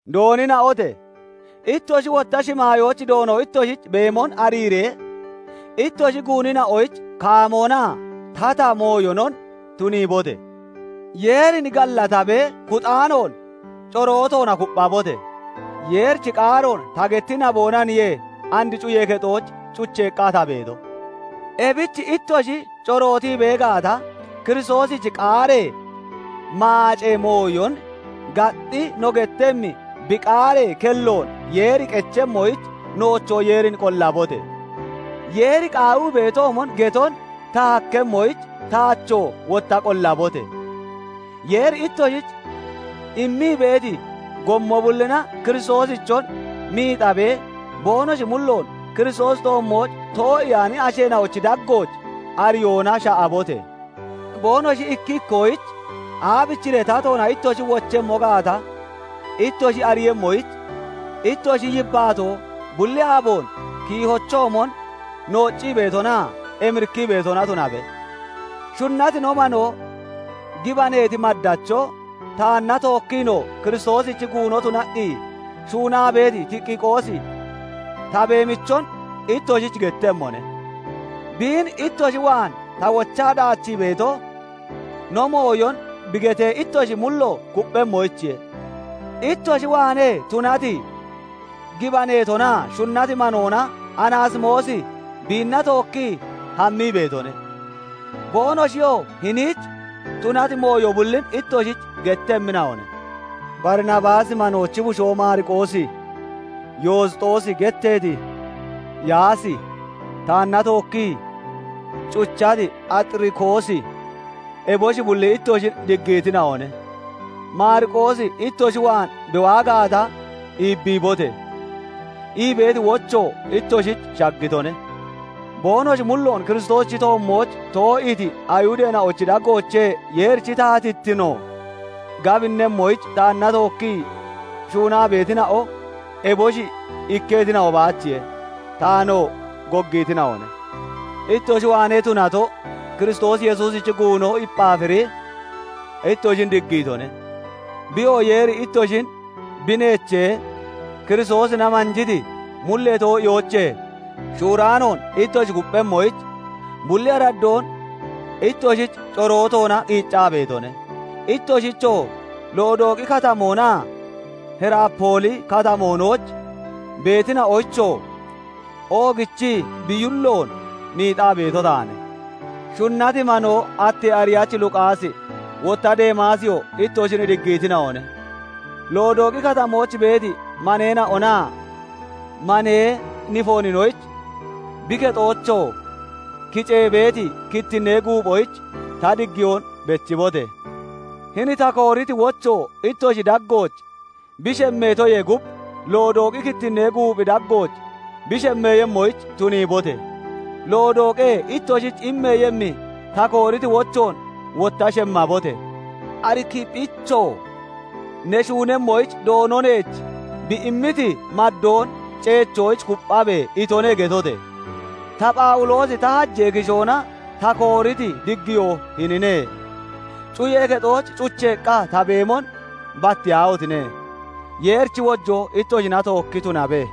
Doonina'ote! Ittoshi wotta shimaayooch Doono ittoshich beemon ariiree, ittoshi guunina'oyich kaamoonaa tata mooyonon tuniibote! Yeerin gallatabee kuxaanoon corootoona kupphabote! Yeerichi qaaroon ta getti naboonaniye and cuyee kexooch cucheeqqa ta beeto; ebich ittoshi corootii bee gaata, Kiristoosichi qaaree maacee mooyon gaxxi no gettemmi bi qaaree kelloon Yeeri qechemmoyich, noochoo Yeerin qollabote! Yeeri qaawii beetoomon geton ta hakkemmoyich taachoo wotta qollabote! Yeeri ittoshich immii beeti gommo bullina Kiristoosichon miixaabee boonoshi mulloon Kiristoosichi toommooch too'iyaani asheena'ochi daggooch ariyoona sha'abote! Boonoshi ikki ikkoyich aabichiree tatoona ittoshi wochemmo gaata ittoshi ariiyemmoyich, ittoshi yibbaatoo bulli aaboon kiihochoomon nooccii beetonaa emirikkii beetona tunabe. Shunnati no manoo, gibaneeti maddacho, taanna tookkiinoo Kiristoosich guuno tunaqqi shuunaa beeti Tikiqoosi ta beemichon ittoshich gettemmone. Biin ittoshi waan ta wochaa daachii beeto, no mooyon bi getee ittoshi mullo kupphemmoyichiye. Ittoshi waanee tunati, gibaneetonaa shunnati manoona Anaasimoosi biinna tookkii hammii beetone. Boonoshiyoo hiniich tunati mooyo bullin ittoshich gettemmina'one. Barinabaasi manoochi bushoo Maariqoosi, Yosxoosi getteeti Yaasi, taanna tookkii cuchati Axirikoosi, eboshi bulli ittoshin diggiitina'one. "Maariqoosi ittoshi waan bi waa gaata, iibbiibote!" ii beeti wocho ittoshich shaggitone. Boonoshi mulloon Kiristoosichi toommooch too'iiti Ayihudeena'ochi daggoochee Yeerichi taatittino gabinnemmoyich taanna tookkii shuunaa beetina'o eboshi ikketina'o baachiye; taanoo goggiitina'one. Ittoshi waanee tunato Kiristoos Yesuusichi guuno Ephaafiri ittoshin diggiitone. Biyoo Yeeri ittoshin bi neechee, Kiristoosina manjiti mullee too'iyoochee shuuraanoon ittoshi kupphemmoyich, bulli araddoon ittoshich corootoona qiiccaa beetone. Ittoshichoo, Lodooqi Katamoo naa Hiraapooli Katamoonooch beetina'oyichoo oogichii bi yulloon miixaa beeto taane. Shunnati manoo attee ariyachi Luqaasi, wotta Deemaasiyoo ittoshin diggiitina'one. Lodooqi Katamooch beeti maneena'onaa manee Nifooninoyich, bi kexoochoo kicee beeti kittinnee guuphoyich ta diggiyoon bechibote! Hini ta kooriti wocho ittoshi daggooch bi shemmeetoyee gub, Lodooqi kittinnee guuphi daggooch bi shemmeeyemmoyich tuniibote! Lodooqee ittoshich immeeyemmi, ta kooriti wochoon wotta shemmabote! Arikiphichoo " 'Ne shuunemmoyich Doono neech bi immiti maddoon ceechoyich kupphabe!' itone" getote! Ta, Phawuloosi ta hajee kishoona ta kooriti diggiyo hinine; cuyee kexooch cucheeqqa ta beemon battiyaahotine! Yeerichi wojoo ittoshina tookki tunabe.